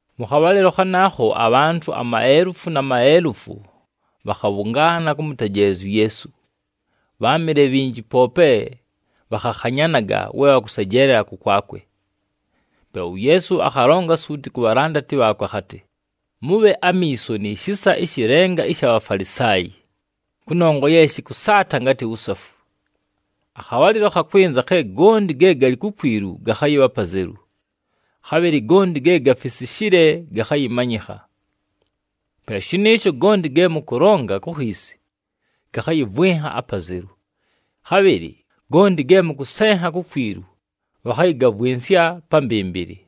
Mʉ khabhalɨlo khanaakho, abhantʉ amaelufu na maelufu bhakhabhʉngaana kʉmʉtejeelezya uYeesu. Bháamɨle bhinji poope bhakhakhanyanaga we bhakʉsejeelela kʉkwakwe. Pe uYeesu akhalonga suuti ku bhalandati bhaakwe akhatɨ, “Mʉbhe amiiso ni shisa ɨshɨ lenga ɨsha Bhafalisaayi, kʉnongwa ye shɨkʉsaata ngatɨ wusafu. Akhabhalɨlo khakwɨnza khe gonti ge galɨ kukwilu gakhayɨbha apazelu, khabhɨlɨ gonti ge gafisishile gakhayɨmanyɨkha. Pe shɨnɨɨsho gonti ge mʉkʉlonga ku khiisi, gakhayɨvwɨnha apazelu. Khabhɨlɨ gonti ge mʉkʉsenha kukwilu, bhakhayɨgavwɨnsya pa mbɨmbɨlɨ.”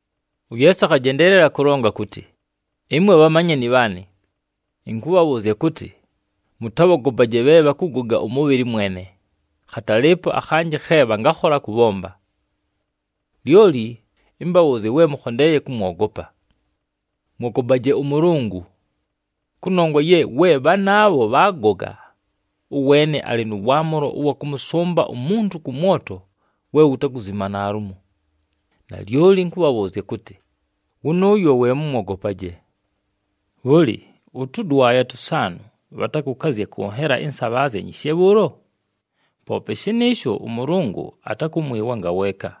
UYeesu akhajendeelela kʉlonga kʉtɨ, “Ɨmwe bhamanyani bhaanɨ, ɨnkʉbhabhʉʉzya kʉtɨ, mʉtabhogopaje bhe bhakʉgoga ʉmʉbhɨlɨ mwene, khatalɨɨpo akhanjɨ khe bhangakhola kʉbhomba. Lyoli ɨmbabhʉʉzye we mʉkhondeeye kʉmwogopa. Mwogopaje ʉMʉlʉngʉ! Kʉnongwa ye we bhanaabho bhaagoga, ʉweene alɨ nʉ waamʉlo ʉwa kʉmʉsʉmba umuntu kʉ mwoto we wutakuzima naalumo! Nalyoli ɨnkʉbhabhʉʉzya kʉtɨ, wʉnʉʉyo we mʉmwogopaje! “Bhʉlɨ, ʉtʉdwaya tʉsaanʉ bhatakʉkazya kʉ nhela ɨnsabhaazya nyishe bhʉʉlo? Poope shɨnɨɨsho, ʉMʉlʉngʉ atakʉmwɨwa ngaweeka.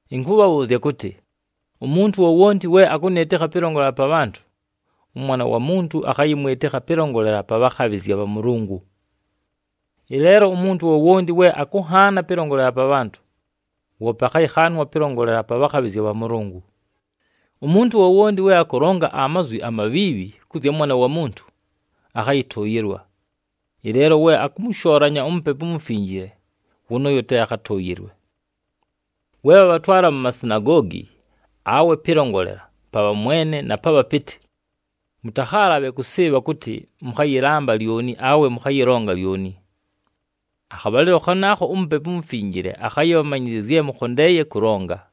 “Ɨnkʉbhabhʉʉzya kʉtɨ, umuntu wowonti we akʉnɨɨtɨkha pɨlongolela pa bhantʉ, ʉMwana wa Muntu akhayɨmwɨtɨkha pɨlongolela pa bhakhabhɨzya bha Mʉlʉngʉ. Ɨleelo umuntu wowonti we akʉnhaana pɨlongolela pa bhantʉ, woope akhayɨkhaanwa pɨlongolela pa bhakhabhɨzya bha Mʉlʉngʉ. Umuntu wowonti we akʉlonga amazwi amabhiibhi kʉ zya Mwana wa Muntu, akhayɨtʉʉyɨlwa. Ɨleelo we akʉmʉshoolanya uMupepu uMufinjile, wʉnʉʉyo te akhatʉʉyɨlwe. “We bhabhatwala mu masinagoogi, awe pɨlongolela pa bhamwene na pa bhapɨtɨ, mʉtakhaalabhe kʉsɨɨbha kʉtɨ mʉkhayɨlamba lyoni awe mʉkhayɨlonga lyoni. Akhabhalɨlo khanaakho uMupepu uMufinjile akhayɨbhamanyɨzya zye mʉkhondeeye kʉlonga.”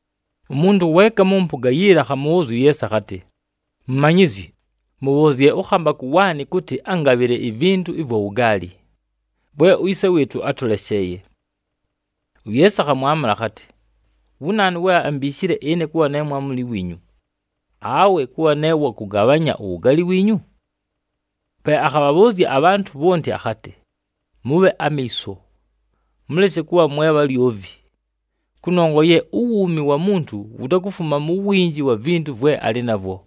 Umuntu weeka mʉ mpʉga yiila akhamʉbhʉʉzya uYeesu akhatɨ, “Mumanyizyi, mʉbhʉʉzye ʉkhambakʉ waanɨ kʉtɨ angabhɨle ivintu ɨvwa wugaali, vwe uyise wɨɨtʉ átʉlesheeye.” UYeesu akhamwamʉla akhatɨ, “Wu naanu we ambiishile ɨne, kʉbha ne mwamuli wiinyu, awe kʉbha ne wakʉgabhanya uwugaali wiinyu?” Pe akhabhabhʉʉzya abhantʉ bhonti akhatɨ, “Mʉbhe amiiso! Mʉleshe kʉbha mwe bhalyovi, kʉnongwa ye uwuumi wa muntu wutakufuma mu winji wa vintu vwe alɨ navwo.”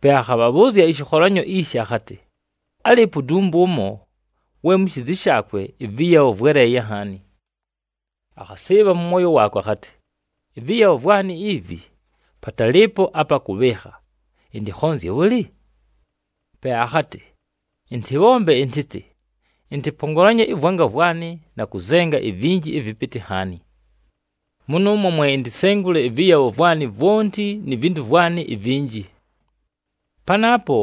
Pe akhabhabhʉʉzya ɨshɨkholanyo ishi akhatɨ, “Álɨɨpo udumbwe ʉmo, we mu shiizi shaakwe ɨvɨyabho vwéleeye nhaani. Akhasɨɨbha mʉ mwoyo waakwe akhatɨ, ‘Ɨvɨyabho vwanɨ ivi, patalɨɨpo apa kʉbhɨɨkha! Ɨntɨkhonzye bhʉlɨ?’ Pe akhatɨ, ‘Ɨntɨbhombe ɨntɨtɨ: ɨntɨpongolanye ɨvwanga vwanɨ, na kʉzenga ivinji ɨvɨpɨtɨ nhaani. Mʉnʉʉmwo mwe intisengule ɨvɨyabho vwanɨ vwonti ni vintu vwanɨ ivinji. Panaapo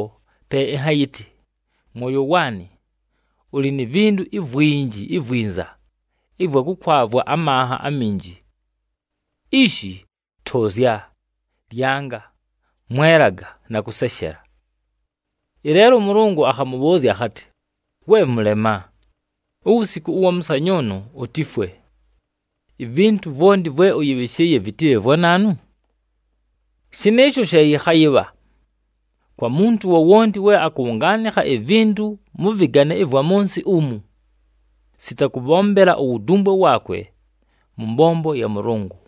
pe ɨnhayɨtɨ, “Mwoyo waanɨ, ʉlɨ ni vintu ivwinji ivwinza ɨvwa kʉkwavwa amanha aminji. Ishi, tʉʉzya, lyanga, mwelaga, na kʉseshela.” ’ Ɨleelo ʉMʉlʉngʉ akhamʉbhʉʉzya akhatɨ, ‘We mʉlema! Uwusiku ʉwa mʉsanyʉʉnʉ utifwe! Ivintu vwonti vwe ʉyɨbhɨshɨɨye, vɨtɨbhe vwa naanu?’ “Shɨnɨɨsho she yɨkhayɨbha, kwa muntu wowonti we akʉbhʉngaanɨkha ivintu mʉ vɨgane ɨvwa mʉ nsɨ umu, sita kʉbhombela uwudumbwe waakwe mʉ mbombo ya Mʉlʉngʉ.”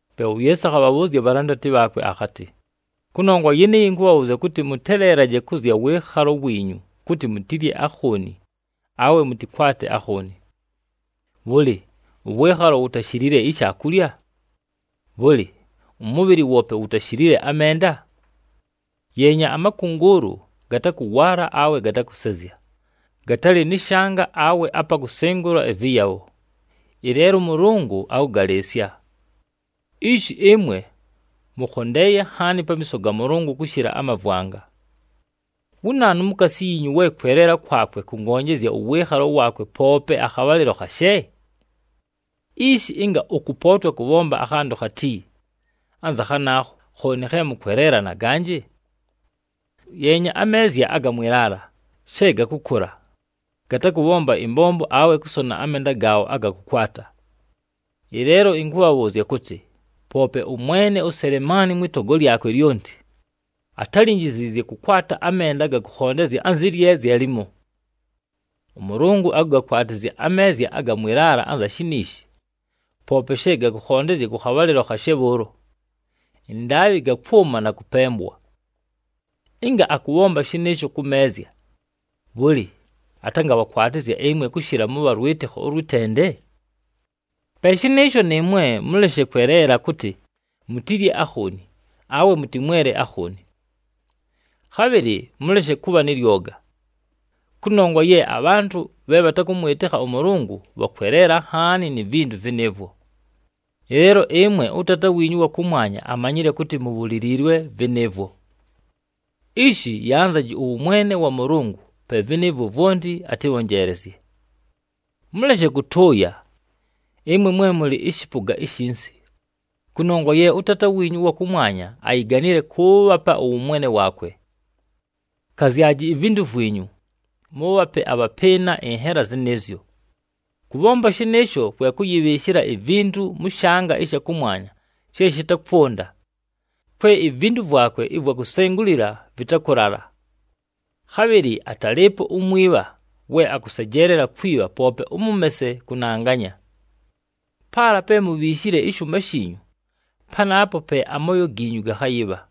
Pe uYeesu akhabhabhʉʉzya abhalandati bhaakwe akhatɨ, “Kʉnongwa yɨnɨɨyo, ɨnkʉbhabhʉʉzya kʉtɨ, mʉteleelaje kʉ zya mʉ wɨɨkhalo wiinyu kʉtɨ mutilye akhooni, awe mʉtɨkwate akhooni. Bhʉlɨ, ʉwɨɨkhalo wutashilile ishaakulya? Bhʉlɨ, ʉmʉbhɨlɨ woope wutashilile amenda? Yeenya amakʉngʉʉlʉ, gatakʉwaala awe gatakʉsezya, gatalɨ nɨ shanga awe apa kusengula ɨvɨyabho, ɨleelo ʉMʉlʉngʉ akʉgalɨɨsya. Ishi ɨmwe mʉkhondeeye nhaani pamiiso ga Mʉlʉngʉ kʉshɨla amavwanga! Wu naanu mukaasi yiinyu we kweleela kwakwe kʉngonjezya ʉwɨɨkhalo waakwe poope akhabhalɨlo khashe? Ishi, ɨnga ʉkʉpootwa kʉbhomba akhantʉ khati anza khanaakho, khooni khe mʉkweleela na ganjɨ? “Yeenya ameezya aga mwɨ laala, she gakʉkʉla. Gatakʉbhomba ɨmbombo awe kʉsona amenda gaabho aga kʉkwata. Ɨleelo ɨnkʉbhabhʉʉzya kʉtɨ, poope ʉmwene uSelemaani mwɨ togo lyakwe lyonti, atálinjiziizye kʉkwata amenda na kʉkhondezya anzɨ lyezya limo! ɄMʉlʉngʉ akʉgakwatɨzya ameezya aga mwɨ laala anza shiniishi, poope she gakʉkhondezya kʉ khabhalɨlo khashe bhʉʉlo, ɨndaabhɨ gakwʉma na kʉpembwa. Ɨnga akʉbhomba shɨnɨɨsho kʉ meezya, bhʉlɨ, atangabhakwatɨzya ɨmwe kʉshɨla, mʉbha lwɨtɨkho ʉlwɨ tende? “Pe shɨnɨɨsho, nɨɨmwe mʉleshe kweleela kʉtɨ mutilye akhooni, awe mʉtɨmwele akhooni. Khabhɨlɨ mʉleshe kʉbha nɨ lyoga. Kʉnongwa ye abhantʉ bhe bhatakʉmwɨtɨkha ʉMʉlʉngʉ bhakweleela nhaani ni vintu vɨnɨɨvwo. Ɨleelo ɨmwe ʉTaata wiinyu ʉwa kʉmwanya amanyile kʉtɨ mubhuliliilwe vɨnɨɨvwo. Ishi yanzaji ʉwʉmwene wa Mʉlʉngʉ, pe vɨnɨɨvwo vwonti atɨbhonjeelezye. “Mʉleshe kʉtʉʉya, ɨmwe mwe mʉlɨ ɨshɨpʉga ishinsi, kʉnongwa ye ʉTaata wiinyu ʉwa kʉmwanya ayiganile kʉʉbhapa ʉwʉmwene waakwe. Kazyaji ivintu vwinyu, mʉʉbhape abhapɨɨna ɨnhela zɨnɨɨzyo. Kʉbhomba shɨnɨɨsho kwe kʉyɨbhɨɨshɨla ivintu mʉ shanga ɨsha kʉmwanya she shɨtakwʉnda, kwe ivintu vwakwe ɨvwa kusengulila vɨtakʉlala. Khabhɨlɨ atalɨɨpo umwibha we akʉsejeelela kwibha poope ʉmʉmese kʉnanganya. Paala pe mubhiishile ɨshʉʉma shiinyu, panaapo pe amooyo giinyu gakhayɨbha.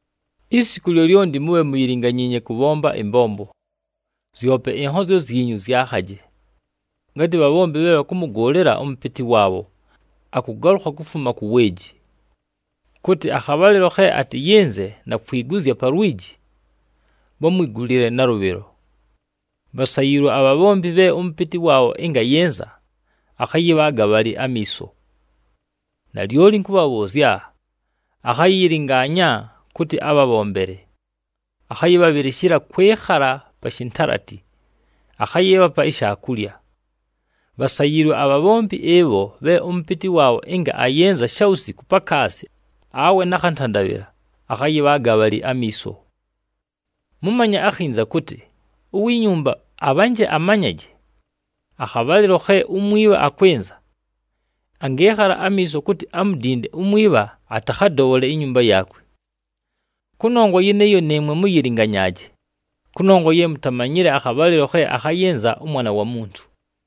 “Isiku lyolyonti mʉyɨlɨnganyaaje kʉbhomba ɨmbombo, zyope ɨnhozyo zyinyu zyakhaje, ngatɨ bhabhombi bhe bhakʉmʉgʉʉlɨla ʉmʉpɨtɨ waabho akʉgalʉkha kufuma ku weeji, kʉtɨ akhabhalɨlo khe atɨyɨnze na kwiguzya pa lwiji, bhamwigulile nalʉbhɨlo. Bhasayiilwe abhabhombi bhe ʉmʉpɨtɨ waabho ɨnga ayɨnza, akhayɨbhaaga bhalɨ amiiso. Nalyoli ɨnkʉbhabhʉʉzya, akhayɨyɨlɨngaanya kʉtɨ abhabhombele, akhayɨbhabhɨlɨshɨla kwɨkhala pa shintalati, akhayɨɨbhapa ishaakulya. Bhasayiilwe abhabhombi ɨbho bhe ʉmʉpɨtɨ waabho ɨnga ayɨnza shawusiku pakaasi awe nakhantandabhɨla, akhayɨbhaaga bhalɨ amiiso. Mʉmanye akhinza kʉtɨ, uwi nyumba abhanje amanyaje akhabhalɨlo khe umwibha akwɨnza, angɨɨkhala amiiso kʉtɨ amudinde umwibha atakhadobhole inyumba yaakwe. Kʉnongwa yɨnɨɨyo, nɨɨmwe mʉyɨlɨnganyaaje kʉnongwa ye mutamanyile akhabhalɨlo khe akhayɨnza ʉMwana wa Muntu.”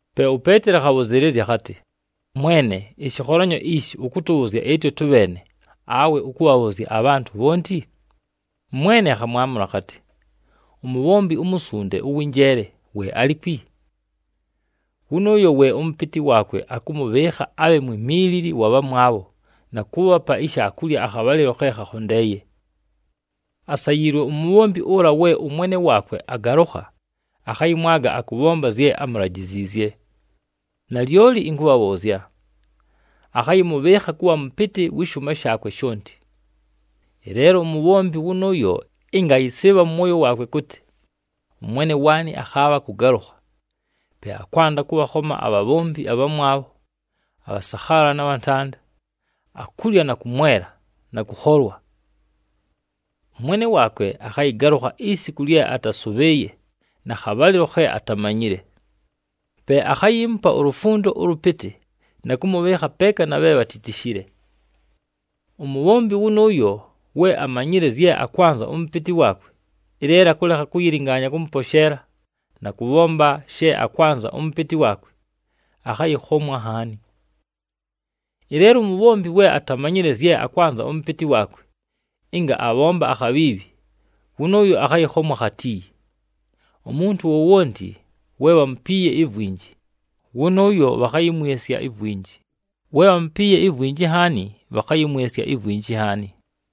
Pe uPeeteli akhabhʉzɨɨlɨzya akhatɨ, “Mwene, ɨshɨkholanyo ishi, ʉkʉtʉbhʉʉzya ɨtwe tʉbheene, awe ʉkʉbhabhʉʉzya abhantʉ bhonti?” ɄMwene akhamwamʉla akhatɨ, “Umubhombi umusunde, ʉwɨ njeele, we alikwi? Wʉnʉʉyo we ʉmʉpɨtɨ waakwe akʉmʉbhɨɨkha abhe mwimiilili wa bhamwabho na kʉʉbhapa ishaakulya akhabhalɨlo khe khakhondeeye. Asayiilwe umubhombi ʉla we ʉmwene waakwe agalʉkha, akhayɨmwaga akʉbhomba zye amulajiziizye. Nalyoli ɨnkʉbhabhʉʉzya, akhayɨmʉbhɨɨkha kʉbha mʉpɨtɨ wɨ shʉʉma shaakwe shonti. Ɨleelo umubhombi wʉnʉʉyo ɨnga ayɨsɨɨbha mʉ mwoyo waakwe kʉtɨ, ‘Ʉmwene waanɨ akhaabha kʉgalʉkha,’ pe akwanda kʉbhakhoma abhabhombi abhamwabho, abhasakhaala na bhantanda, akulya na kʉmwela, na kʉkholwa. Ʉmwene waakwe akhayɨgalʉkha isiku lye atasʉbhɨɨye na khabhalɨlo khe atamanyile. Pe akhayiimupa ulufundo ʉlʉpɨtɨ na kʉmʉbhɨɨkha peeka na bhe bhatitishile. “Umubhombi wʉnʉʉyo we amanyile zye akwanza ʉmʉpɨtɨ waakwe, ɨleelo akʉlekha kʉyɨlɨngaanya kʉmʉposheela, na kʉbhomba she akwanza ʉmʉpɨtɨ waakwe, akhayɨkhomwa nhaani. Ɨleelo umubhombi we atamanyile zye akwanza ʉmʉpɨtɨ waakwe, ɨnga abhomba akhabhiibhi, wʉnʉʉyo akhayɨkhomwa khati. Umuntu wowonti we bhamupiiye ivwinji, wʉnʉʉyo bhakhayɨmwɨsya ivwinji, we bhamupiiye ivwinji nhaani, bhakhayɨmwɨsya ivwinji nhaani.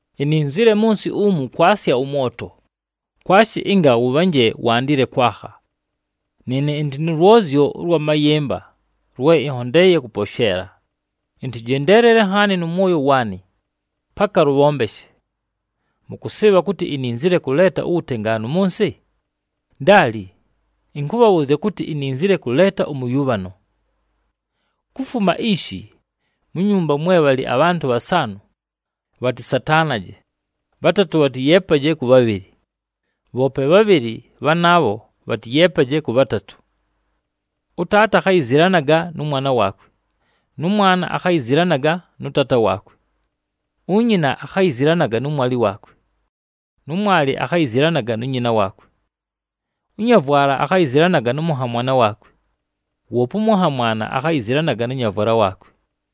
“Ininzile mʉ nsɨ umu kwasya ʉmwoto, kwashi ɨnga wʉbhanje wandile kwakha! Nɨɨne ɨndɨ nʉ lwozyo ʉlwa mayɨmba lwe ɨnhondeeye kʉposheela, ɨntɨjendeelele nhaani mʉ mwoyo waanɨ, paka lʉbhombeshe. Mʉkʉsɨɨbha kʉtɨ ininzile kʉleeta uwutengaanu mʉ nsɨ? Ndaali! Ɨnkʉbhabhʉʉzya kʉtɨ, ininzile kʉleeta ʉmʉyʉbhano. Kufuma ishi, mu nyumba mwe bhalɨ abhantʉ bhasaanʉ, bhatɨsataanaje, bhatatʉ bhatɨyeepaje kʉ bhabhɨlɨ, bhoope bhabhɨlɨ bhanaabho bhatɨyeepaje kʉ bhatatʉ. Ʉtaata akhayizilanaga nʉ mwana waakwe, nʉ mwana akhayizilanaga nʉ taata waakwe. Unyina akhayizilanaga nʉ mwalɨ waakwe, nʉ mwalɨ akhayizilanaga nu nyina waakwe. Ʉnyavwala akhayizilanaga nʉ mʉnhamwana waakwe, woope ʉmʉnhamwana akhayizilanaga nʉ nyavwala waakwe.”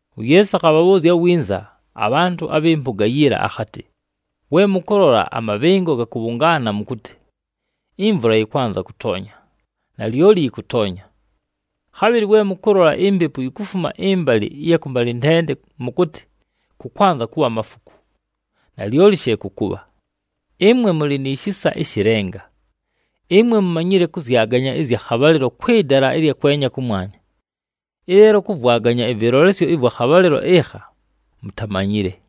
UYeesu akhabhabhʉʉzya winza abhantʉ abhɨ mpʉga yiila akhatɨ, “We mʉkʉlola amabhɨngo gakʉbhʉngaana mʉkʉtɨ, ‘Imvula yɨkwanza kʉtoonya,’ nalyoli yɨkʉtoonya. Khabhɨlɨ we mʉkʉlola impepu yikufuma ɨmbalɨ ɨya kʉmbalɨntende mʉkʉtɨ, ‘Kʉkwanza kʉbha amafuku,’ nalyoli she kʉkʉbha. Ɨmwe mʉlɨ ni shisa ɨshɨ lenga! Ɨmwe mumanyile kʉzyaganya ɨzya khabhalɨlo kwɨ dala ɨlya kwenya kʉmwanya, ɨleelo kʉvwaganya ɨvɨlolesyo ɨvwa khabhalɨlo ɨkha mutamanyile.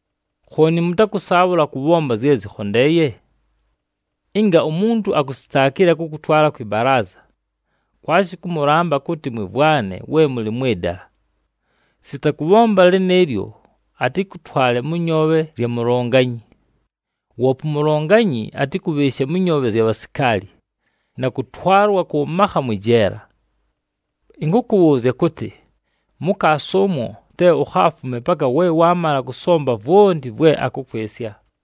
“Khooni mʉtakʉsaabhʉla kʉbhomba zye zɨkhondeeye? Ɨnga umuntu akusitaakile, akʉkʉtwala kwɨ balaaza, kwashi kʉmʉlamba kʉtɨ mwɨmvwane we mʉlɨ mwɨ dala. Sita kʉbhomba lɨnɨɨlyo, atɨkʉtwale mʉ nyoobhe zya mulonganyi, woope umulonganyi, atɨkʉbhɨɨshe mʉ nyoobhe zya bhasikaali na kʉtwalwa kʉ makha mwɨ jeela. Ɨnkʉkʉbhʉʉzya kʉtɨ, mukaasi ʉmwo te ukhaafume paka we waamala kʉsomba vwonti vwe akʉkwɨsya!”